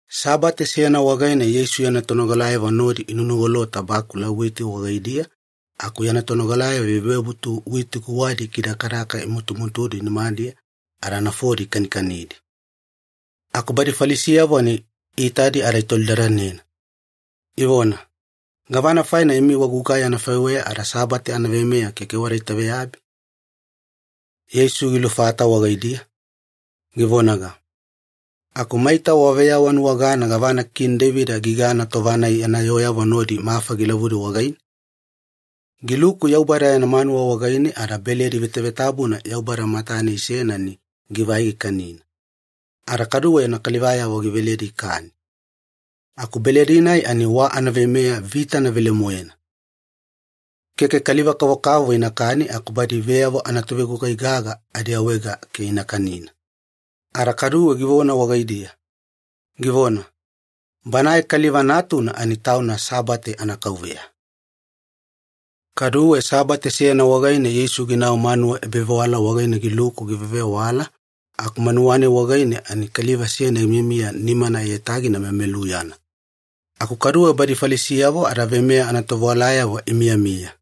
Sabate seyana wagaine Yeisu yana tonogalayavo nodi inunugolota bakula witi wagaidiya aku yana tonogalayavo ivebutu witi guwadi ikidakadaka imutumutudi nimadiya ada nafodi ikanikanidi. Aku badi Falisiyavo ani iitadi ada itolidadana, ivona, “Gavana faina imi wagugai anafaiweya ada Sabate anaveimeya keke wada itaveyabi?” Yeisu gilufata wagaidiya, givonaga, “Aku maita waveyawanuwagana gavana Kini Deivida gigana tova-nai yana yooyavo nodi mafa gilavudi wagaine? Giluku Yaubada yana manuwa wagaine ada beledi vevetabuna Yaubada matane isena ani givai gikanina, ada kaduwe yana kalivayavo giveledi ikani. Aku beledi-nai ani wa anaveimeya vitana velemoena. Keke kaliva-kavokavovo inakani aku badi veyavo anatovegugai gaga adiawaega ke ina kanina.” Ada kaduwe givona wagaidiya, givona, “Banae Kaliva Natuna ani Tauna Sabate anaKauveya.” Kaduwe Sabate seyana wagaine Yeisu ginau manuwa ebavewala wagaine giluku givewavewala aku manuwa-nai wagaine ani kaliva seyana gimiyamiya nimana aiyatagina memeluyana. Aku kaduwe badi Falisiyavo ada veimeya anatovewalayavo imiyamiya,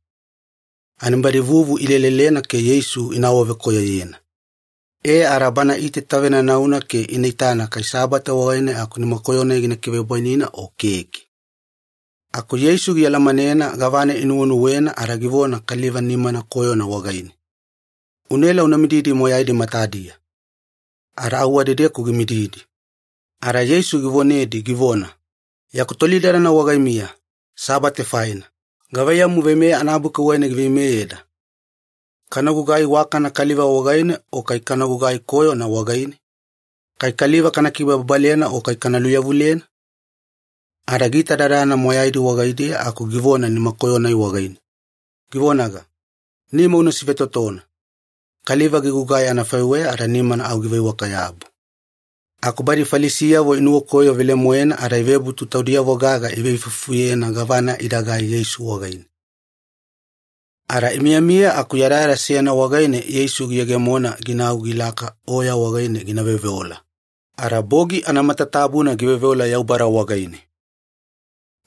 ani badi vuvu ilelelena ke Yeisu ina awavekoyoyena. E ada Bana iitaitavenanauna ke ina itana kai Sabate wagaine aku nimakoyo-nai gina kivebwaina o keke. Aku Yeisu gialamanena gavana inuwenuwena ada givona kaliva nimana koyona wagaine, “Unaela una mididi moyaidi matadiya.” Ada au wadedeku gimididi. Ada Yeisu givonedi givona, “Yaku tolidadana wagaimiya, Sabate faina, gavaiyamu Veimeya anabuki wagaine giveimeyeda? Kana gugai iwakana kaliva wagaine o kai kana gugai koyona wagaine? Kai kaliva kana kibababalena o kai kana luyavulena?” Ada giitadadana moyaidi wagaidiya aku givona nimakoyo wagaine, givonaga, “Nima una sivetotona.” Kaliva gigugai anafaiweya ada nimana au giveiwaka-yabu. Aku badi Falisiyavo inuwakoyo velemoena ada ivebutu taudiyavo gaga iveifuifufuyena gavana idagai Yeisu wagaine. Ada imiyamiya aku yadayada seyana wagaine Yeisu giyegemona ginau gilaka oya wagaine gina veoveola, ada bogi anamatatabuna giveoveola Yaubada wagaine.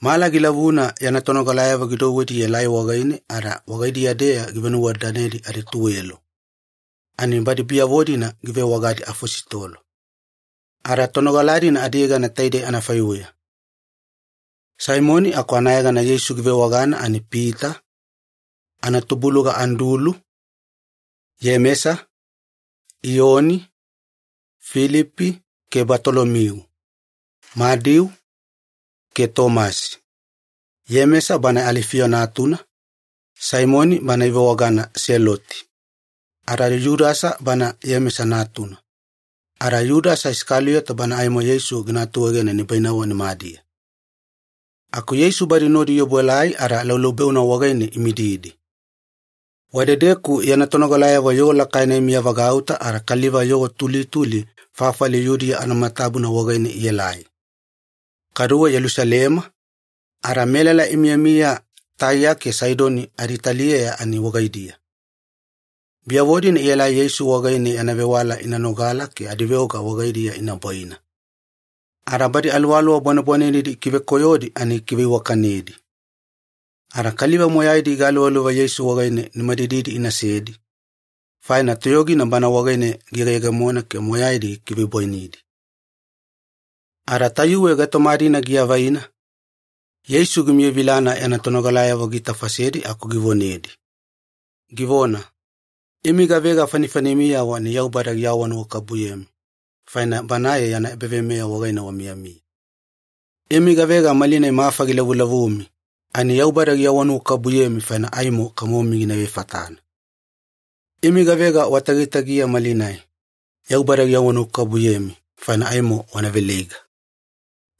Mala gilavuna yana tonogalayavo gidouwedi ielai wagaine ada wagaidiya-deya givenuwadadanedi adituwelo, ani badi biyavo-dina givewagadi ‘afositolo’. Ada tonogala-dina adiyegana taidei anafaiweya. Saimoni aku anayegana Yeisu givewagana ani Pita, anatubuluga Andulu, Iyemesa, Iyoni, Filipi, ke Batolomiu, Madiu, ke Tomasi, Iyemesa banae Alifiyo natuna, Saimoni bana ivewagana Seloti, ada Yudasa banae Iyemesa natuna, ada Yudasa Isakaliyota banae aimo Yeisu gina atuegena nibainavo nimadiya. Aku Yeisu badi nodi iobuelai ada laulaubeuna wagaine imididi. Wadedeku yana tonogalayavo yoo lakaina imiyavagauta ada kaliva yoo tulituli fafali Yudiya anamatatabuna wagaine ielai, kaduwe Yelusalema, ada melala imiyamiya Taiya ke Saidoni aditaliyeya ani wagaidiya. Biyavo-dina ielai Yeisu wagaine yana vewala ina nogala ke adiveoga wagaidiya ina bwaina. Ada badi aluwaluwa bwanebwanenedi ikivekoyodi ani gikiveiwakanedi. Ada kaliva moyaidi igaluvaluva Yeisu wagaine nimadididi inasedi, faina toyogina Bana wagaine giyegeyegemona ke moyaidi gikivebwainidi. Ada tayuwe gaitoma-dina giavaina, Yeisu gimiyavilana yana tonogalayavo giitafasedi aku givonedi, givona, “Imi gavega fanifanimiyavo ani Yaubada giawanuwakabubuyemi faina Banae yana ebaveimeya wagaine wamiyamiya. Imi gavega malinai mafa gilavulavumi ani Yaubada giawanuwakabubuyemi faina aimo kamomi gina ivefatana. Imi gavega watagitagiya malinai, Yaubada giawanuwakabubuyemi faina aimo wana veleiga.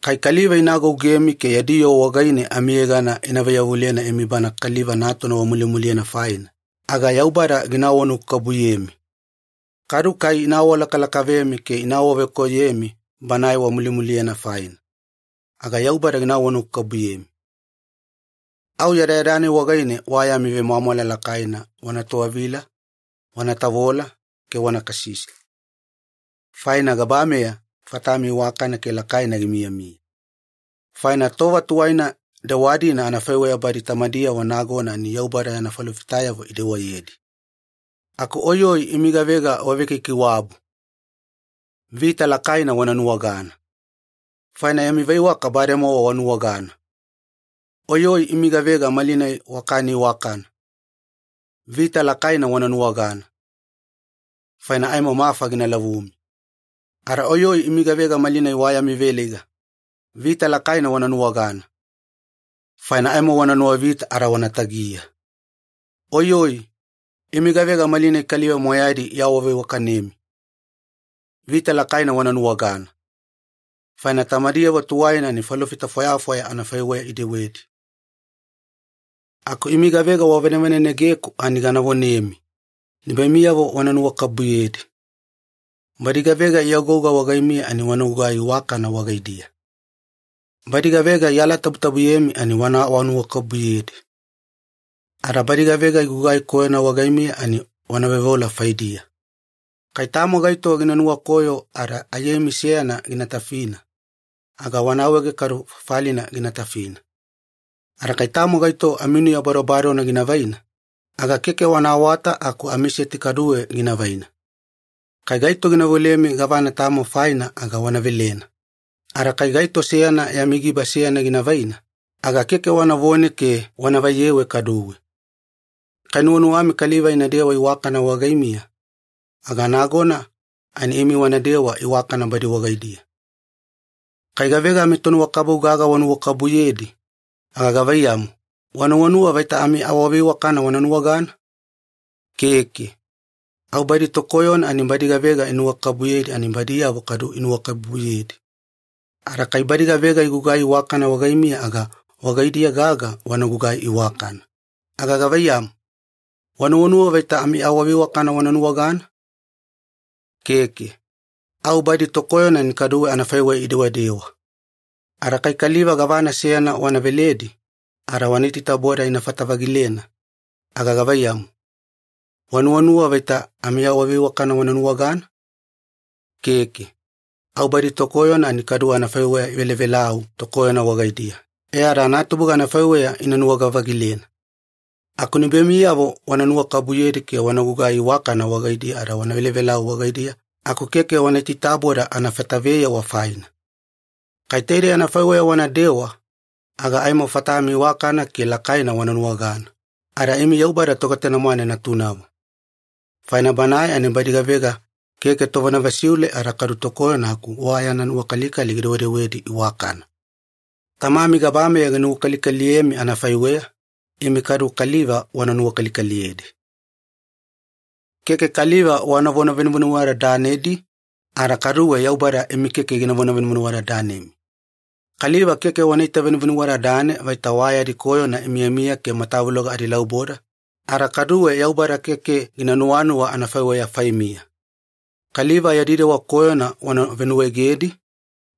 Kai kaliva ina agougemi ke yadi yoo wagaine amiyegana ina vaiyavulena imi Bana Kaliva Natuna wamulimuliyena faina, aga Yaubada gina awanuwakabubuyemi. Kadu kai ina awalakalakavemi ke ina awavekoyoyemi Banae wamulimuliyena faina, aga Yaubada gina awanuwakabubuyemi. Au yadayada-nai wagaine wa yami vemwamwala lakaina wana towavila wana tavola ke wana kasisi, faina gabameya fatami iwakana ke lakaina gimiyamiya. Faina tova tuwaina dewa-dina anafaiweya badi tamadiyavo nagona ani Yaubada yana falofitayavo idewayedi. Aku oiyoi imi gavega wavekaikaiwabu! Vita lakaina wana nuwagana! Faina yami veiwaka bademowa wanuwagana. Oiyoi imi gavega malinai wakani iwakana! Vita lakaina wana nuwagana! Faina aimo mafa gina lavumi. Ada oiyoi imi gavega malinai wa yami veleiga! Vita lakaina wana nuwagana! Faina aimo wana nuwavita ada wana tagiya. Oiyoi! Imi gavega malinai kaliva moyaidi iawaveiwakanemi! Vita lakaina wana nuwagana! Faina tamadiyavo tuwaina ani falofita fwayafwaya anafaiweya idewedi. “Aku imi gavega wavanevanenegeku ani gana vonemi, nibaimiyavo wana nuwakabubuyedi. Badi gavega iagouga wagaimiya ani wana gugai iwakana wagaidiya. Badi gavega ialatabutabuyemi ani wana awanuwakabubuyedi. Ada badi gavega igugai koyona wagaimiya ani wana veoveola faidiya. Kai tamo gaito gina nuwakoyo ada aiyaimi seyana gina tafina, aga wana awaege kadu fafalina gina tafina. Ada kai tamo gaito aminuya badobadona gina vaina, aga keke wana awata aku amiseti kaduwe gina vaina. Kai gaito gina veolemi gavana tamo faina aga wana velena. Ada kai gaito seyana yami giba seyana gina vaina, aga keke wanavone ke wana vaiyewe kaduwe. Kai nuwanuwami kaliva inadewa iwakana wagaimiya, aga nagona ani imi wanadewa iwakana badi wagaidiya. “Kai gavega amitonuwakabubu gaga wanuwakabubuyedi, aga gavaiyamu, wanuwanuwa vaita amiawaveiwakana wana nuwagana? Keke. Au badi tokoyona ani badi gavega inuwakabubuyedi ani badiyavo kaduwe inuwakabubuyedi. Ada kai badi gavega igugai iwakana wagaimiya ada wagaidiya gaga wana gugai iwakana, aga gavaiyamu, wanuwanuwa vaita amiawaveiwakana wana nuwagana? Keke. Au badi tokoyona ani kaduwe anafaiweya idewadewa. Ada kai kaliva gavana seyana wana veledi ada wana itaitaboda inafata-vagilena, aga gavaiyamu, wanuwanuwa vaita amiawaveiwakana wana nuwagana? Keke. Au badi tokoyona ani kaduwe anafaiweya ivelavelau tokoyona wagaidiya e ada anatubuga anafaiweya ina nuwaga-vagilena. Aku nibaimiyavo wana nuwakabubuyedi ke wana gugai iwakana wagaidiya ada wana velavelau wagaidiya aku keke wana itaitaboda anafata-veyewa faina. Kai taidei anafaiweya wanadewa aga aimo fatami iwakana ke lakaina wana nuwagana, ada imi Yaubada Togetanemwane natunavo. Faina Banae ani badi gavega keke tovonavesiule ada kaduwe tokoyona aku wa yana nuwakalikali gidewedewedi iwakana. Tamami gabameya ginuwakalikaliyemi anafaiweya, imi kadu kaliva wana nuwakalikaliyedi. “Keke kaliva wanavona venuvenuwadadanedi, ada kaduwe Yaubada imi keke ginavona venuvenuwadadanemi. Kaliva keke wana itavenuwadadane vaita wa yadi koyona imiyamiya ke matavuloga adilauboda, ada kaduwe Yaubada keke gina nuwanuwa anafaiweya faimiya. Kaliva yadi dewa koyona wana venuwaegedi,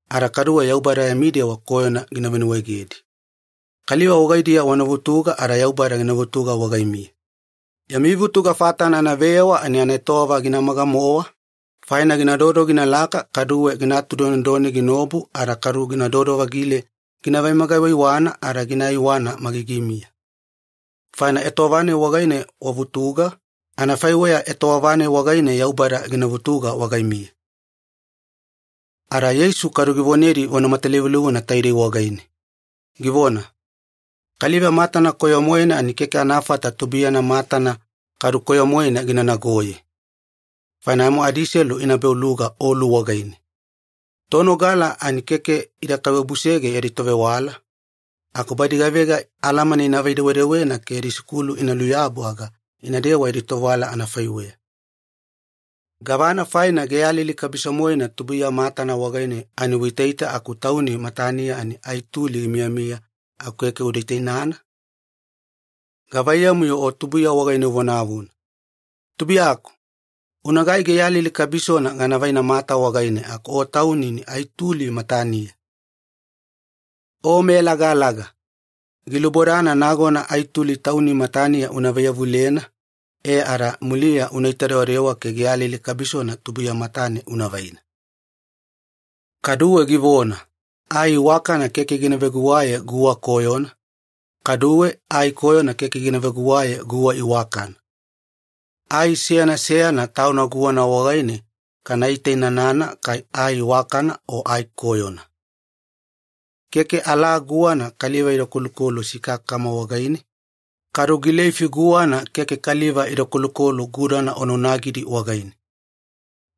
ada kaduwe Yaubada yami dewa koyona gina venuwaegedi. Kaliva wagaidiya wana vutuga ada Yaubada gina vutuga wagaimiya. Yami vutuga fatana anaveyewa ani anaetowava ginamaga-mowa, faina ginadodo ginalaka kaduwe gina atudonedone ginaobu ada kadu ginadodo-vagile gina vemaga-iwaiwana ada gina iwana magigimiya. Faina etowava-nai wagaine wavutuga, anafaiweya etowava-nai wagaine Yaubada gina vutuga wagaimiya.” Ada Yeisu kadu givonedi vona matalivulivuna taidei wagaine, givona, “Kaliva matana koyo-moena ani keke anafata tubuiyana matana kaduwe koyo-moena gina nagoye, faina aimo adiselu ina beuluga olu wagaine. Tonogala ani keke ida kaiwabusege yadi tovewala, aku badi gavega alamana inavai-dewedewena ke yadi sikulu ina luyabu aga inadewa yadi tovewala anafaiweya. Gavana faina geyalili kabiso-moena tubuiya matana wagaine ani uitaita aku tauni mataniya ani ai tuli gimiyamiya aku keke uda itainana? Gavaiyamu-yo tubuiya wagaine uvonavona, ‘Tubuiyaku, unagai geyalili kabisona gana vaina mata wagaine’ aku o tauni ani ai tuli mataniya? O meyalagalaga, gilubodana nagona ai tuli tauni mataniya una vaiyavulena, e ada muliya unaita dewadewa ke geyalili kabisona tubuiya matane una vaina.” Kaduwe givona, “Ai iwakana keke gina veguwaye guwa koyona, kaduwe ai koyona keke gina veguwaye guwa iwakana. Ai seyana seyana tauna guwana wagaine kana itainanana kai ai iwakana o ai koyona. Keke alaa guwana kaliva ida kolukolu sikakakama wagaine, kadu gileifi guwana keke kaliva ida kolukolu gudana onaonagidi wagaine.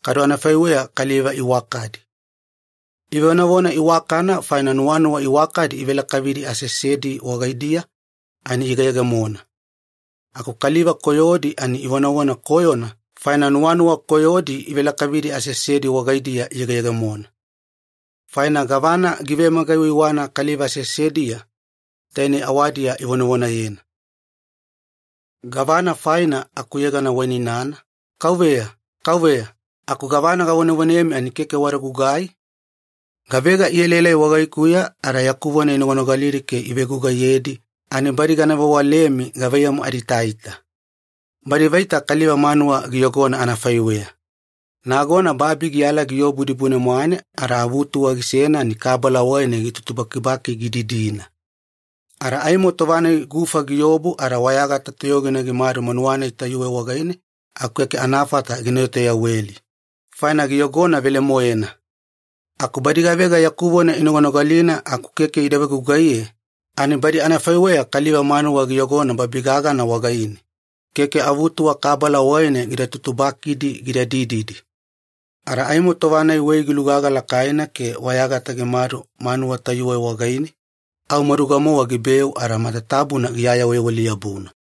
Kadu anafaiweya kaliva iwakadi. Ivonavona iwakana faina nuwanuwa iwakadi ivelakavidi aseasedi wagaidiya ani iyegeyegemona. Aku kaliva koyodi ani ivonavona koyona faina nuwanuwa koyodi ivelakavidi aseasedi wagaidiya iyegeyegemona. Faina gavana givemaga-iwaiwana kaliva aseasediya, tainei awadiya ivonavonayena. “Gavana faina akuyegana wainainana, ‘Kauveya, Kauveya,’ aku gavana gavonevonemi ani keke wada gugugai? Gavega ielaelai wagaikuya ada yaku vona inoganogalidi ke ivegugaiyedi ani badi gana vewalemi gavaiyamu adiitaita. Badi vaita kaliva manuwa giyogona anafaiweya. Nagona babi giyala giobu dibune-mwane ada avutuwa gisena ani kabala wagaine gitutubakibaki gididina. Ada aimo tova-nai wei gilugaga lakaina ke wayagata gimaduna manuwa-nai tayuwe wagaine aku keke anafata gina etoyaweli, faina giyogona velemoena. Aku badi gavega yaku vona inoganogalina aku keke ida vegugaiye ani badi anafaiweya kaliva manuwa giyogona babi gagana wagaine, keke avutuwa kabala wagaine gida tutubakidi gida dididi. Ada aimo tova-nai wei gilugaga lakaina ke wayagata gimadu manuwa tayuwe wagaine, au maduga-mowa gibeu ada matatabuna giayaweyaweli-yabuna.”